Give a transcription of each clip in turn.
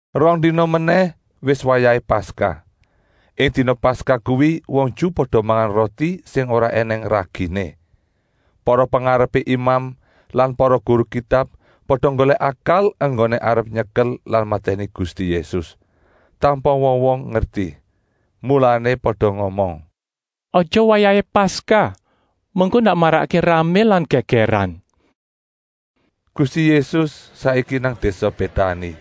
Rong dina menèh wis wayahé Paskah. Ing dina Paskah kuwi wong Ju pada mangan roti sing ora ènèng raginé. Para pengarepé imam lan para guru Kitab pada nggolèk akal enggoné arep nyekel lan matèni Gusti Yésus, tanpa wong-wong ngerti. Mulané pada ngomong: “Aja wayahé Paskah, mengko ndak marakké ramé lan gègèran.” Gusti Yésus saiki nang désa Bétani,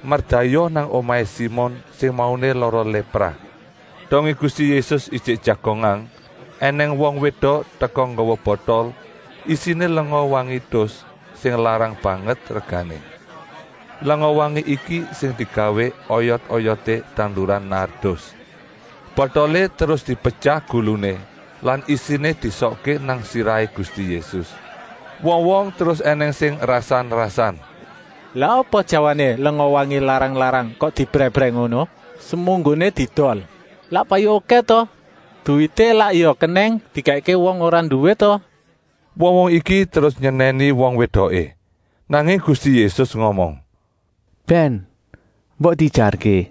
merdayoh nang omahé Simon sing mauné lara lépra. Dongé Gusti Yésus ijik jagongan ènèng wong wédok teka nggawa botol isiné lenga wangi tus sing larang banget regané. Lenga wangi iki sing digawé oyot-oyoté tanduran nardus. Botolé terus dipetyah guluné lan isiné diesokké nang sirahé Gusti Yésus. Wong-wong terus ènèng sing rasan-rasan: “Lah apa jawané lenga wangi larang-larang kok diebrèh-ebrèh ngono? Semunggoné diedol lak payu okèh ta? Duwité lak ya kenèng dikèkké wong ora nduwé ta?” Wong-wong iki terus nyenèni wong wédoké. Nanging Gusti Yésus ngomong: “Bèn, mbok diejarké!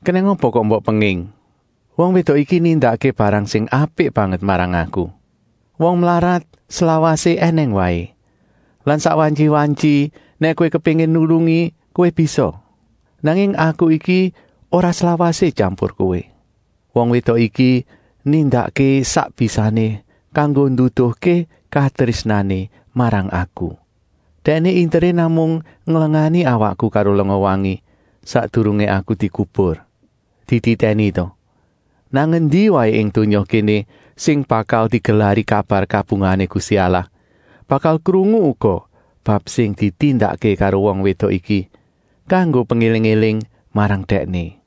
Kenèng apa kok mbok penging? Wong wédok iki nindakké barang sing apik banget marang Aku. Wong mlarat slawasé ènèng waé lan sak wantyi-wantyi nèk kowé kepéngin nulungi kowé bisa. Nanging Aku iki ora slawasé tyampur kowé. Wong wédok iki nindakké sak bisané kanggo nduduhké katrésnané marang Aku. Dèkné interé namung nglengani awakku karo lenga wangi, sakdurungé Aku dikubur. Dititèni ta, nang endi waé ing donya kéné sing bakal digelari kabar kabungahané Gusti Allah bakal krungu uga bab sing ditindakké karo wong wédok iki, kanggo pengéling-éling marang dèkné.”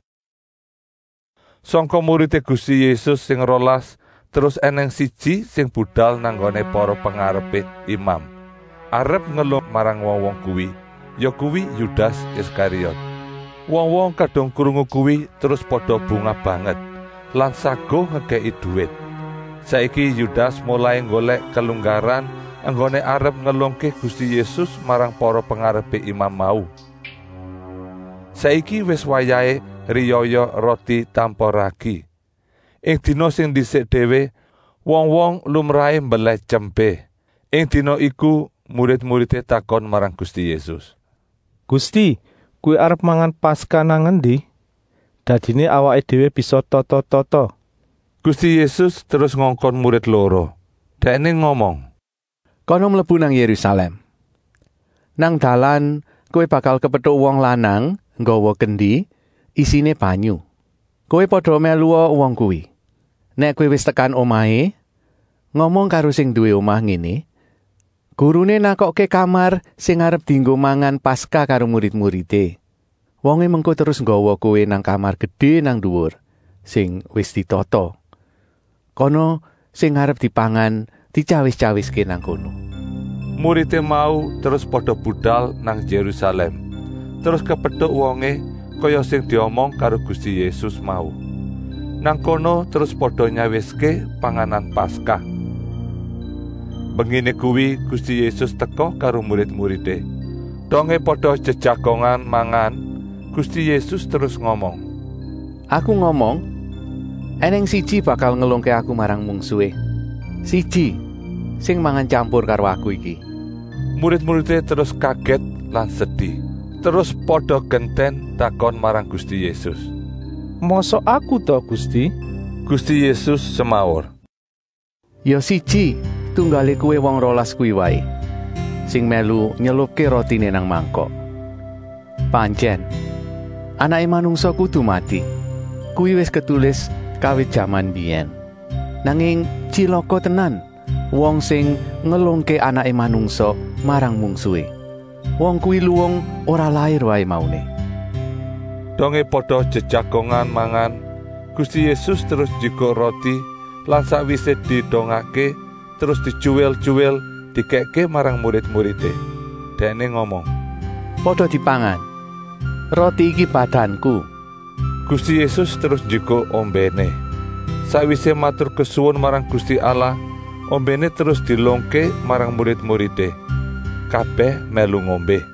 Sangka muridé Gusti Yésus sing rolas terus ènèng siji sing budal nang nggoné para pengarepé imam arep ngelungké Dèkné marang wong-wong kuwi, yakuwi Yudas Iskariot. Wong-wong kadung krungu kuwi terus pada bungah banget lan saguh ngekèki duwit. Saiki Yudas molai nggolèk kelunggaran enggoné arep ngelungké Gusti Yésus marang para pengarepé imam mau. Saiki wis wayahé Riyaya Roti Tanpa Ragi. Ing dina sing ndisik déwé wong-wong lumrahé mbelèh tyempé. Ing dina iku murid-muridé takon marang Gusti Yésus: “Gusti, Kowé arep mangan Paskah nang endi? Dadiné awaké déwé bisa tata-tata!” Gusti Yésus terus ngongkon murid loro. Dèkné ngomong: “Kana mlebu nang Yérusalèm. Nang dalan kowé bakal kepetuk wong lanang nggawa kendi isiné banyu. Kowé pada mèlua wong kuwi. Nèk kowé wis tekan omahé, ngomong karo sing nduwé omah ngéné: ‘Guruné nakokké kamar sing arep dienggo mangan Paskah karo murid-muridé.’ Wongé mengko terus nggawa kowé nang kamar gedé nang nduwur sing wis ditata. Kana sing arep dipangan dityawis-tyawiské nang kono.” Muridé mau terus pada budal nang Yérusalèm, terus kepetuk wongé, kaya sing diomong karo Gusti Yésus mau. Nang kono terus pada nyawiské panganan Paskah. Mbenginé kuwi Gusti Yésus teka karo murid-muridé. Dongé pada jejagongan mangan Gusti Yésus terus ngomong: “Aku ngomong, ènèng siji bakal ngelungké Aku marang mungsuhé. Siji sing mangan tyampur karo Aku iki.” Murid-muridé terus kagèt lan sedi. Terus pada gentèn takon marang Gusti Yésus: “Mosok aku ta, Gusti?” Gusti Yésus semaur: “Ya siji tunggalé kowé wong rolas kuwi waé, sing mèlu nyelupké rotiné nang mangkok. Pantyèn, Anaké Manungsa kudu mati. Kuwi wis ketulis kawit jaman mbiyèn. Nanging tyilaka tenan wong sing ngelungké Anaké Manungsa marang mungsuhé. Wong kuwi luwung ora lair waé mauné.” Dongé pada jejagongan mangan Gusti Yésus terus njikuk roti lan sakwisé didongakké terus dityuwil-tyuwil dikèkké marang murid-muridé. Dèkné ngomong: “Pada dipangan. Roti iki badanku.” Gusti Yésus terus njikuk ombèné. Sakwisé maturkesuwun marang Gusti Allah ombèné terus dielungké marang murid-muridé. Kabèh mèlu ngombé.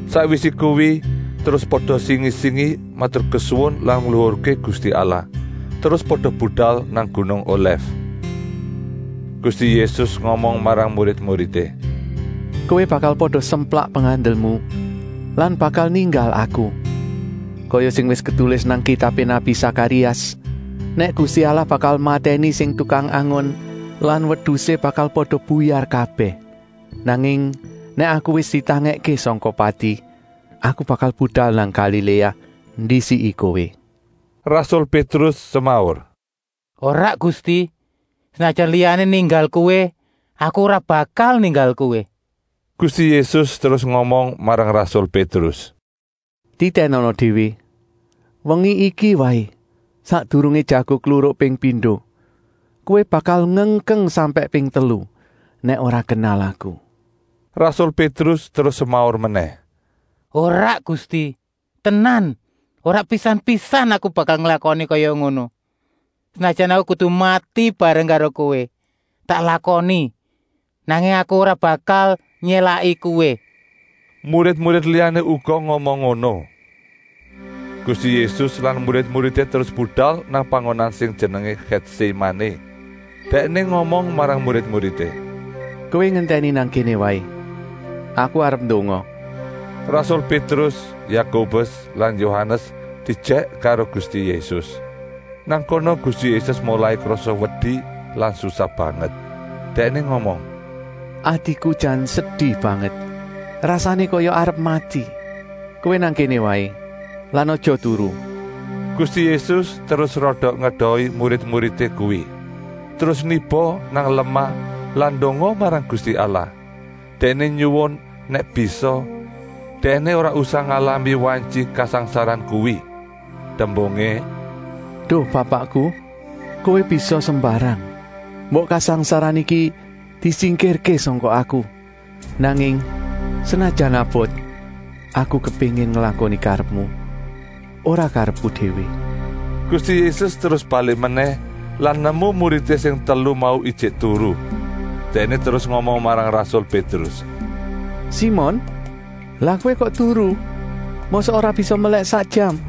Sakwisé kuwi terus pada singi-singi maturkesuwun lan ngluhurké Gusti Allah, terus pada budal nang gunung Olèf. Gusti Yésus ngomong marang murid-muridé: “Kowé bakal pada semplak pengandelmu lan bakal ninggal Aku, kaya sing wis ketulis nang kitabé nabi Sakarias, nèk Gusti Allah bakal matèni sing tukang angon lan wedusé bakal pada buyar kabèh. Nanging nèk Aku wis ditangèkké sangka pati, Aku bakal budal nang Galiléa, ndisiki kowé.” Rasul Pétrus semaur: “Ora Gusti, senajan liyané ninggal Kowé, aku ora bakal ninggal Kowé.” Gusti Yésus terus ngomong marang rasul Pétrus: “Titènana déwé, wengi iki waé, sakdurungé jago kluruk ping pindo, kowé bakal ngengkeng sampèk ping telu nèk ora kenal Aku.” Rasul Pétrus terus semaur menèh: “Ora Gusti, tenan, ora pisan-pisan aku bakal nglakoni kaya ngono. Senajan aku kudu mati bareng karo Kowé, tak lakoni, nanging aku ora bakal nyélaki Kowé.” Murid-murid liyané uga ngomong ngono. Gusti Yésus lan murid-muridé terus budal nang panggonan sing jenengé Gètsémané. Dèkné ngomong marang murid-muridé: “Kowé ngentèni nang kéné waé. Aku arep ndonga.” Rasul Pétrus, Yakobus lan Yohanes diejèk karo Gusti Yésus. Nang kono Gusti Yésus molai krasa wedi lan susah banget. Dèkné ngomong: “Atiku jan sedi banget. Rasané kaya arep mati. Kowé nang kéné waé lan aja turu.” Gusti Yésus terus rada ngedohi murid-muridé kuwi, terus niba nang lemah lan ndonga marang Gusti Allah. Dèkné nyuwun, nèk bisa, Dèkné ora usah ngalami wantyi kasangsaran kuwi. Tembungé: “Duh Bapakku, Kowé bisa sembarang. Mbok kasangsaran iki disingkirké sangka Aku! Nanging senajan abot, Aku kepéngin nglakoni karepmu, ora karepku déwé.” Gusti Yésus terus balik menèh lan nemu muridé sing telu mau ijik turu. Dèkné terus ngomong marang rasul Pétrus: “Simon, lah kowé kok turu. Mosok ora bisa melèk sak jam?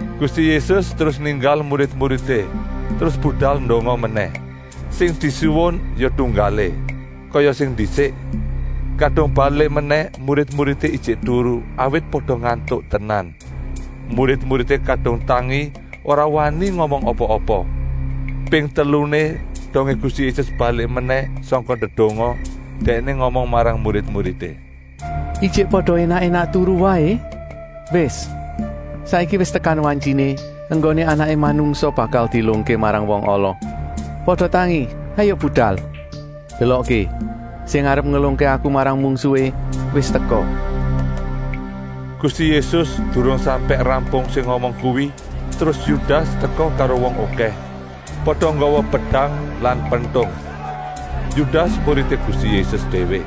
Gusti Yésus terus ninggal murid-muridé terus budal ndonga menèh. Sing disuwun ya tunggalé, kaya sing ndisik. Kadung balik menèh murid-muridé ijik turu, awit pada ngantuk tenan. Murid-muridé kadung tangi ora wani ngomong apa-apa. Ping teluné, dongé Gusti Yésus balik menèh sangka ndedonga, Dèkné ngomong marang murid-muridé: “Ijik pada énak-énak turu waé? Wis, saiki wis tekan wantyiné enggoné Anaké Manungsa bakal dielungké marang wong ala. Pada tangi, hayuk budal. Delokké, sing arep ngelungké Aku marang mungsuhé wis teka!” Gusti Yésus durung sampèk rampung sing ngomong kuwi terus Yudas teka karo wong okèh, pada nggawa pedang lan pentung. Yudas muridé Gusti Yésus déwé,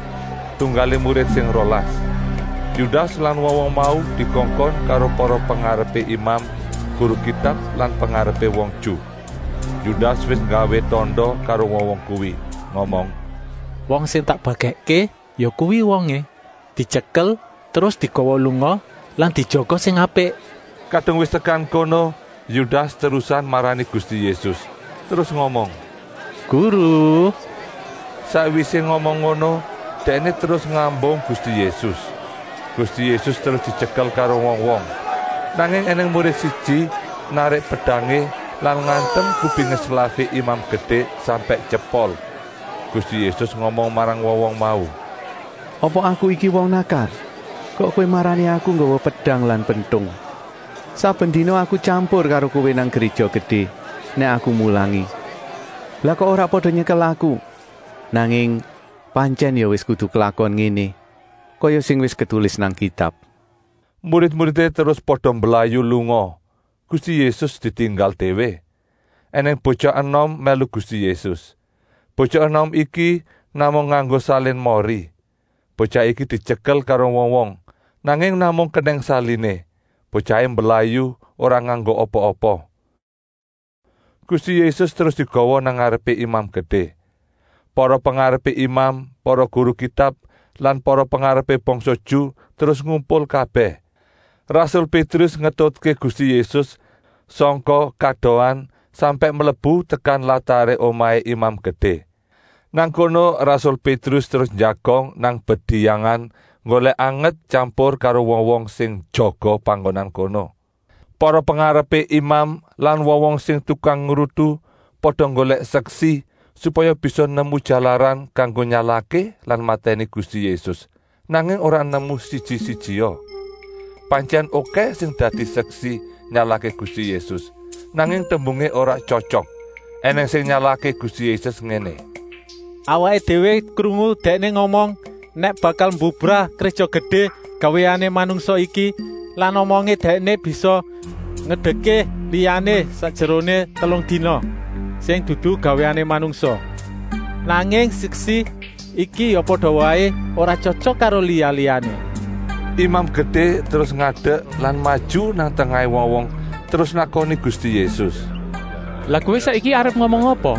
tunggalé murid sing rolas. Yudas lan wong-wong mau dikongkon karo para pengarepé imam, guru Kitab lan pengarepé wong Ju. Yudas wis nggawé tanda karo wong-wong kuwi ngomong: “Wong sing tak ambung, yakuwi wongé. Dityekel terus digawa lunga lan dijaga sing apik!” Kadung wis tekan kono Yudas terusan marani Gusti Yésus, terus ngomong: “Guru!” Sakwisé ngomong ngono dèkné terus ngambung Gusti Yésus. Gusti Yésus terus dityekel karo wong-wong. Nanging ènèng murid siji narik pedangé lan ngantem kupingé slafé Imam Gedé sampèk tyepol. Gusti Yésus ngomong marang wong-wong mau: “Apa Aku iki wong nakal kok kowé marani Aku nggawa pedang lan pentung. Saben dina Aku tyampur karo kowé nang Gréja Gedé nèk Aku mulangi. Lah kok ora pada nyekel Aku? Nanging pantyèn ya wis kudu klakon ngéné, kaya sing wis ketulis nang Kitab.” Murid-muridé terus pada mblayu lunga, Gusti Yésus ditinggal déwé. Enèng botyah enom mèlu Gusti Yésus. Botyah enom iki namung nganggo salin mori. Botyah iki dityekel karo wong-wong, nanging namung kenèng saliné, botyahé mblayu ora nganggo apa-apa. Gusti Yésus terus digawa nang ngarepé Imam Gedé. Para pengarepé imam, para guru Kitab lan para pengarepé bangsa Ju terus ngumpul kabèh. Rasul Pétrus ngetutké Gusti Yésus sangka kadohan sampèk mlebu tekan lataré omahé Imam Gedé. Nang kono rasul Pétrus terus njagong nang bediyangan nggolèk anget tyampur karo wong-wong sing njaga panggonan kono. Para pengarepé imam lan wong-wong sing tukang ngrutu pada nggolèk seksi, supaya bisa nemu jalaran kanggo nyalahké lan matèni Gusti Yésus, nanging ora nemu siji-sijia. Pantyèn okèh sing dadi seksi nyalahké Gusti Yésus, nanging tembungé ora tyotyok. Enèng sing nyalahké Gusti Yésus ngéné: “Awaké déwé krungu Dèkné ngomong nèk bakal mbubrah Gréja Gedé gawéané manungsa iki lan omongé dèkné bisa ngedekké liyané sakjeroné telung dina, sing dudu gawéané manungsa. Nanging seksi iki ya pada waé ora tyotyok karo liya-liyané.” Imam Gedé terus ngadek lan maju nang tengahé wong-wong terus nakoni Gusti Yésus: “Lah kowé saiki arep ngomong apa?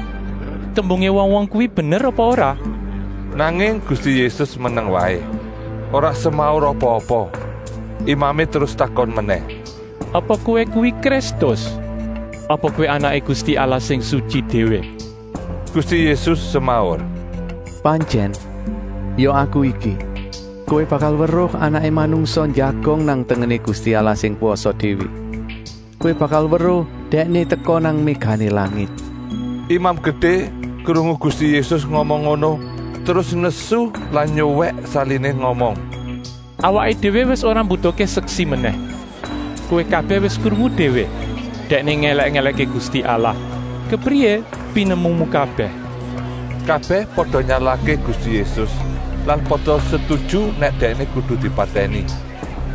Tembungé wong-wong kuwi bener apa ora?” Nanging Gusti Yésus meneng waé, ora semaur apa-apa. Imamé terus takon menèh: “Apa kowé kuwi Kristus? Apa kowé Anaké Gusti Allah sing Sutyi Déwé?” Gusti Yésus semaur: “Pantyèn, ya Aku iki. Kowé bakal weruh Anaké Manungsa njagong nang tengené Gusti Allah sing Kwasa Déwé. Kowé bakal weruh Dèkné teka nang mégané langit.” Imam Gedé krungu Gusti Yésus ngomong ngono terus nesu lan nyuwèk saliné ngomong: “Awaké déwé wis ora mbutuhké seksi menèh. Kowé kabèh wis krungu déwé Dèkné ngèlèk-èlèkké Gusti Allah. Kepriyé pinemumu kabèh?” Kabèh pada nyalahké Gusti Yésus lan pada setuju nèk Dèkné kudu dipatèni.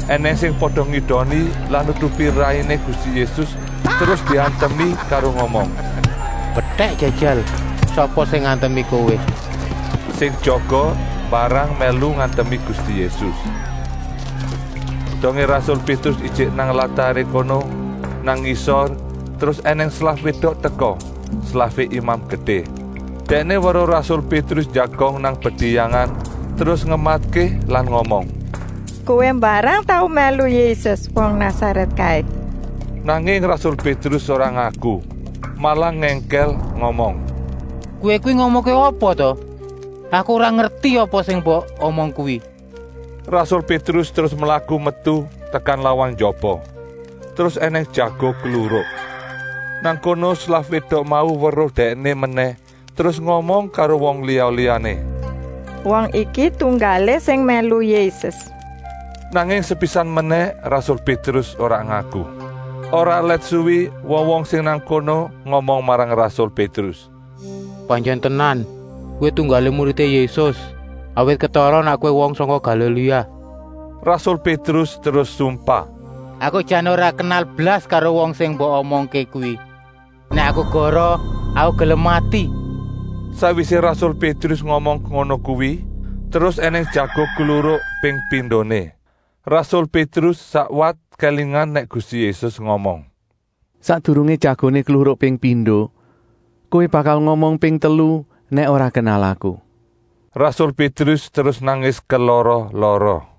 Enèng sing pada ngidoni lan nutupi rainé Gusti Yésus terus diantemi karo ngomong: “Mbedèk jajal, sapa sing ngantemi Kowé!” Sing jaga mbarang mèlu ngantemi Gusti Yésus. Dongé rasul Pétrus ijik nang lataré kono, nang ngisor, terus ènèng slaf wédok teka, slafé Imam Gedé. Dèkné weruh rasul Pétrus njagong nang bediyangan terus ngematké lan ngomong: “Kowé mbarang tau mèlu Yésus, wong Nasarèt kaé.” Nanging rasul Pétrus ora ngaku, malah ngèngkèl ngomong: “Kowé kuwi ngomongké apa ta? Aku ora ngerti apa sing mbok omong kuwi.” Rasul Pétrus terus mlaku metu tekan lawang njaba. (Terus ènèng jago kluruk.) Nang kono slaf wédok mau weruh dèkné menèh terus ngomong karo wong liya-liyané: “Wong iki tunggalé sing mèlu Yésus.” Nanging sepisan menèh rasul Pétrus ora ngaku. Ora let suwi wong-wong sing nang kono ngomong marang rasul Pétrus: “Pantyèn tenan, kowé tunggalé muridé Yésus, awit ketara nèk kowé wong sangka Galiléa.” Rasul Pétrus terus sumpah: “Aku jan ora kenal blas karo wong sing mbok omongké kuwi. Nèk Aku goroh aku gelem mati.” Sakwisé rasul Pétrus ngomong ngono kuwi, terus ènèng jago kluruk ping pindoné. Rasul Pétrus sakwat kélingan nèk Gusti Yésus ngomong: “Sakdurungé jagoné kluruk ping pindo kowé bakal ngomong ping telu nèk ora kenal Aku.” Rasul Pétrus terus nangis kelara-lara.